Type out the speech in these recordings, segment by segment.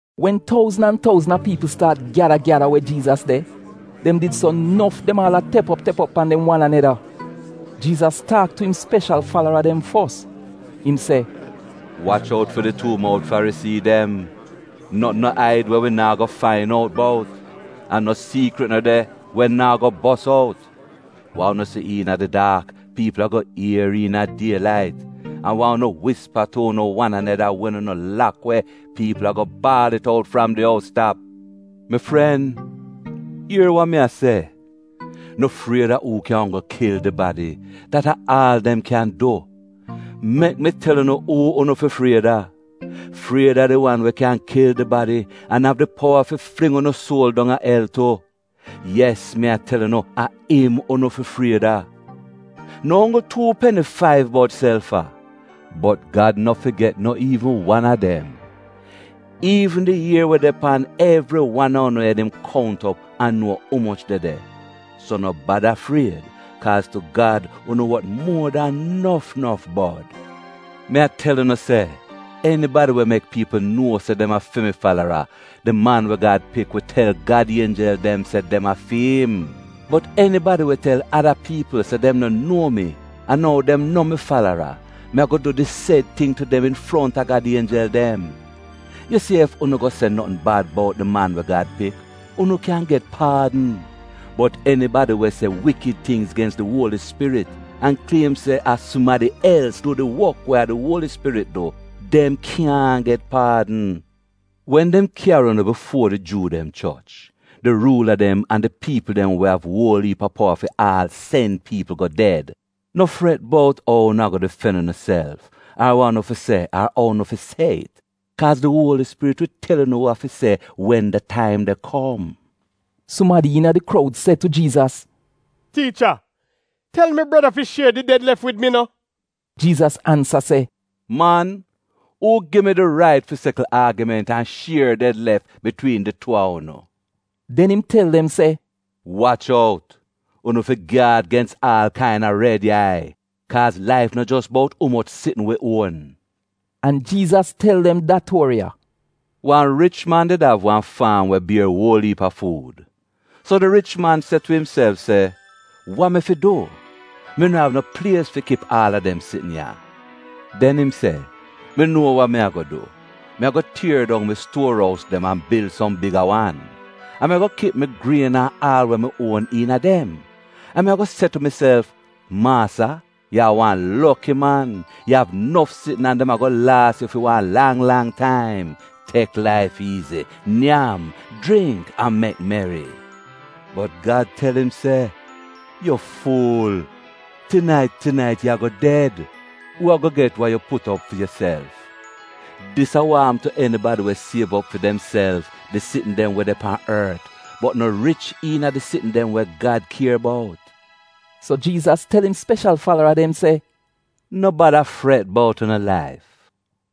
Wen touzn an touzn a piipl staat gyada gyada we Jiizas de, dem did so nof dem aal a tep op tep op pan dem wan aneda. Jiizas taak tu im speshal falara dem fos, im se, “Wach out fi di tuu mout Farisii dem. Notn no aid we wi naa go fain out bout, an no siikrit no de we naa go bos out. Wa unu se iina di daak, piipl ago ier iina die lait, an wa unu wispa tu unu wan aneda wen unu lak we, piipl ago baal it out fram di ous tap. “Mi fren, ier wa mi a se, no fried a uu kyan onggl kil di badi — dat a aal dem kyan du! Mek mi tel unu uu unu fi fried a: fried a di wan we kyan kil di badi an av di powa fi fling unu suol dong a el tu. Yes mi a tel unu, a im unu fi fried a. No onggl tuu peni faiv bod sel fa? Bot Gad no figet no iivn wan a dem. Iivn di ier we de pan evri wan a unu ed im kount op an nuo umoch de de. So no bada fried kaaz tu Gad unu wot muo dan nof nof bod. “Mi a tel unu se enibadi we mek piipl nuo se dem a fi mi falara, di Man we Gad Pik wi tel Gad ienjel dem se dem a fi'im. Bot enibadi we tel ada piipl se dem no nuo mi an ou dem no mi falara, mi ago du di sed ting tu dem infronta Gad Ienjel dem. Yu si ef unu go se notn bad bout di Man we Gad Pik, unu kyan get paadn, bot enibadi we se wikid tingz gens di Uoli Spirit an kliem se a sumadi els du did wok we a di Uoli Spirit du — dem kyaahn get paadn. “Wen dem kyari unu bifuo di Juu dem choch, di ruula dem an di piipl dem we av uol iip a powa fi aal sen piipl go ded, no fret bout ou unu ago difen unuself, ar wa unu fi se ar ou unu fi se it, kaaz di Uoli Spirit wi tel unu wa fi se wen da taim de kom. Sumadi iina di kroud se tu Jiizas, “Tiicha, tel mi breda fi shier di ded-lef wid mi no.” Jiizas ansa se, “Man, uu gi mi di rait fi sekl aagiment an shier ded-lef bitwiin di tuu a unu?” Den im tel dem se, “Wach out! Unu fi gyaad gens aal kaina red yai, kaaz laif no jos bout umoch sitn wi uon.” An Jiizas tel dem da tuori ya: “Wan rich man did av wan faam we bier uol iip a fuud. So di rich man se tu imself se, ‘Wa mi fi du? Mi no av no plies fi kip aal a dem sitn ya.’ “Den im se, ‘Mi nuo wa mi ago du. Mi ago tier dong mi stuor ous dem an bil som biga wan, an mi ago kip mi grien an aal we mi uon iina dem. An mi ago se tu miself, maasa yu a wan loki man. Yu av nof sitn an dem ago laas yu fi wan lang lang taim. Tek laif iizi, nyam, jringk an mek meri.’ “Bot Gad tel im se, ‘Yu fuul! Tinait tinait, yu ago ded. Uu ago get wa yu put op fi yuself?’ “Dis a wa apm tu enibadi we siev op fi demself di sitn dem we de pan ort bot no rich iina di sitn dem we Gad kier bout.” So Jiizas tel im speshal falara dem se: “No bada fret bout unu laif,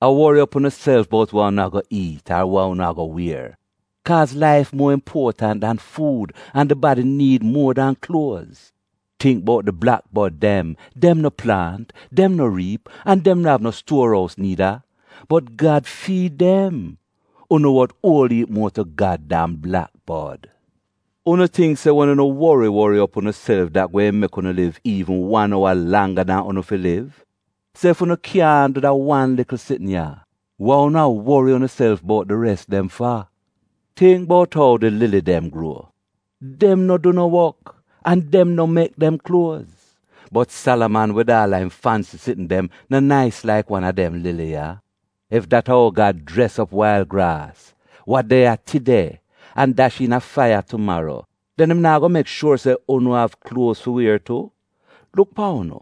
a wori op unuself bout wa unu ago iit, ar wa unu ago wier. Kaaz laif muo impuotant dan fuud an di badi niid muo dan kluoz. Tingk bout di blak bod dem! Dem no plaant, dem no riip, an dem no av no stuor ous niida, bot Gad fiid dem? Unu wot uol iip muo tu Gad dan blak bod! Unu tingk se wen unu wori wori op unuself dat gweehn mek unu liv iivn wan owa langga dan unu fi liv? So ef unu kyaahn du da wan likl sitn ya, wa unu a wori unuself bout di res dem fa? “Tingk bout ou di lili dem gruo. Dem no du no wok an dem no mek dem kluoz, bot Salaman wid aal a im fansi sitn dem no nais laik wan a dem lili ya. Ef dat a ou Gad jres op wail graas, wa de ya tide, an dash iina faiya tumaro, den im naa go mek shuor se unu av kluoz fi wier tu? Luk pan unu,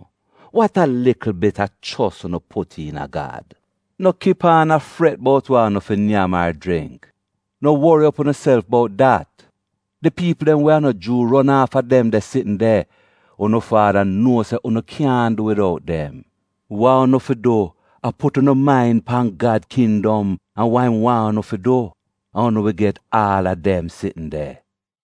wat a likl bit a chos unu put iina Gad! No kip aan a fret bout wa unu fi nyam ar jringk; no wori op unuself bout dat. Di piipl dem we a no Juu ron aafa dem de sitn de. Unu Faada nuo se unu kyaahn du widout dem. Wa unu fi du a put unu main pan Gad kindom an wa im waahn unu fi du, an unu wi get aal a dem sitn de.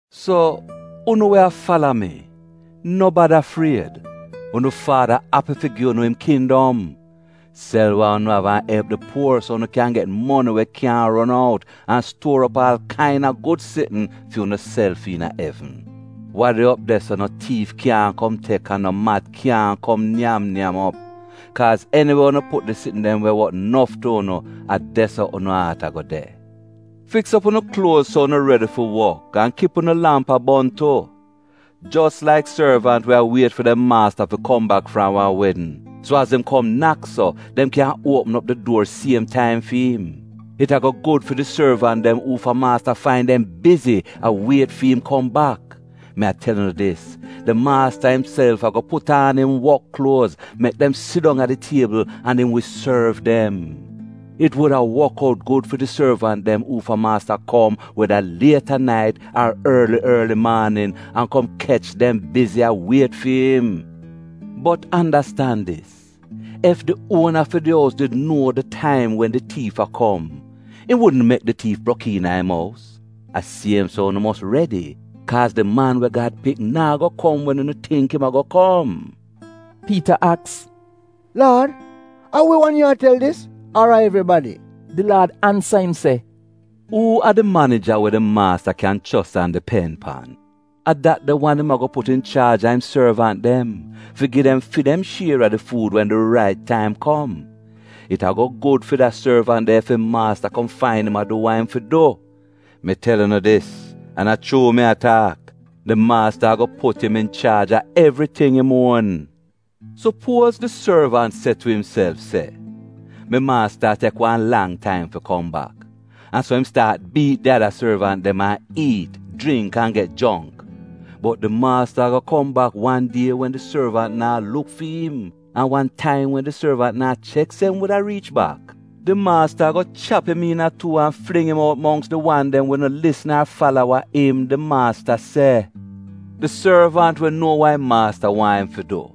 “So, unu we a fala mi, no bada fried. Unu Faada api fi gi unu im kindom. Sel wa unu av an elp di puor so unu kyan get moni we kyaahn ron out an stuor op aal kaina gud sitn fi unuself iina evn. Wa de op de so no tiif kyaahn kom tek an no mat kyaahn kom nyam nyam op. Kaaz eniwe unu put di sitn dem we wot nof tu unu a de-so unu aat ago de.” “Fiks op unu kluoz so unu redi fi wok an kip unu lamp a bon tu, Jos laik sorvant we a wiet fi dem maasta fi kom bak fram wan wedn, so az im kom nak so, dem kyan uopm op di duor siem taim fi'im. It ago gud fi di sorvant dem uufa maasta fain dem bizi a wiet fi'im kom bak. Mi a tel unu dis, di maasta imself ago put aan im wok kluoz, mek dem sidong a di tiebl, an im wi sorv dem. It wuda wok out gud fi di sorvant dem uufa maasta kom weda liet a nait ar orli orli maanin an kom kech dem bizi a wiet fi im. Bot andastan dis! Ef di uona fi di ous did nuo di taim wen di tiif a kom, im wudn mek di tiif brok iina im ous. A siem so unu mos redi, kaaz di Man we Gad Pik naa go kom wen unu tingk im ago kom.” Piita aks, “Laad a wi wan yu a tel dis, ar a evribadi?” Di Laad ansa im se, “Uu a di manija we di maasta kyan chos an dipen pan? A dat de wan im ago put inchaaj a im sorvant dem, fi gi dem fi dem shier a di fuud wen di rait taim kom. It ago gud fi da sorvant de ef im maasta kom fain im a du wa im fi du. Mi tel unu dis, an a chuu mi a taak, di maasta ago put im inchaaj a evriting im uon. Supuoz di sorvant se tu imself se, ‘Mi maasta a tek wan lang taim fi kom bak,’ an so im staat biit di ada sorvant dem an iit, jringk an get jongk. Bot di maasta ago kom bak wan die wen di sorvant naa luk fi im, an wan taim wen di sorvant naa chek se im wuda riich bak. Di maasta ago chap im iina tuu an fling im out mongks di wan dem we no lisn ar fala wa im, di maasta, se. “Di sorvant we nuo wa im maasta waahn im fi du,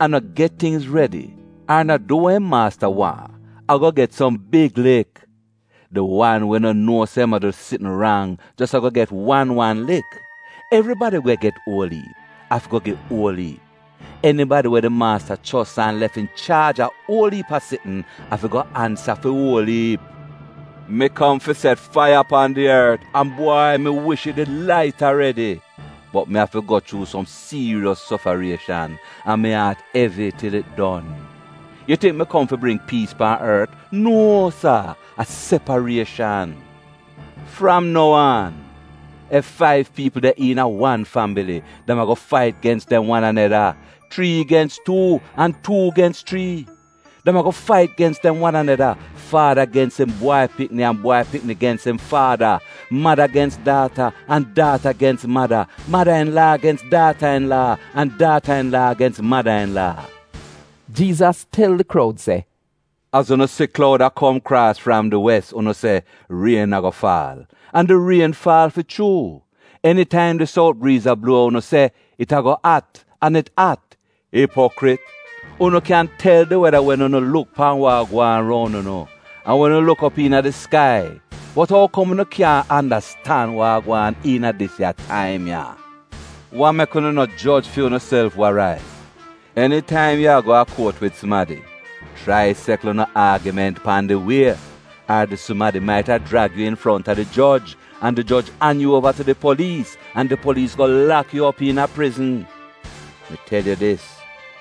an no get tingz redi ar no du wa im maasta waahn ago get som big lik. Di wan we no nuo se im a du sitn rang jos ago get wan wan lik. Evribadi we get uol iip, afi go gi uol iip. Enibadi we di maasta chos an lef inchaaj a uol iip a sitn, afi go ansa fi uol iip.” “Mi kom fi set faiya pan di ort, an bwai mi wish it did lait aredi. Bot mi afi go chuu som siiriyos sofarieshan, an mi aat evi til it don! Yu tingk mi kom fi bring piis pan ort? Nuo sa, a separieshan. Fram nou aan ef faiv piipl de iina wan fambili, dem ago fait gens dem wan aneda, chrii gens tuu an tuu gens chrii. Dem ago fait gens dem wan aneda, faada gens im bwai pikni an bwai pikni gens im faada, mada gens daata an daata gens mada, mada-in-laa gens daata-in-laa an daata-in-laa gens mada-in-laa.” Jiizas tel di kroud se “Az unu si kloud a kom kraas fram di wes, unu se, ‘Rien ago faal,’ an di rien faal fi chuu. Enitaim di sout briiz a bluo, unu se, ‘It ago at,’ an it at. “Ipokrit! Unu kyan tel di weda wen unu luk pan wa gwaan roun unu an wen unu luk op iina di skai bot ou kom unu kyaahn andastan wa a gwaan iina dis ya taim ya?” “Wa mek unu no joj fi unuself wa rait? Enitaim yu a go a kuot wid sumadi, chrai sekl unu aagiment pan di wie, ar di sumadi maita jrag yu infronta di joj, an di joj an yu uova tu di poliis an di poliis go lak yu op iina prizn. Mi tel yu dis,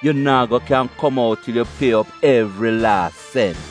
yu naa go kyan kom out til yu pie op evri laas sent.”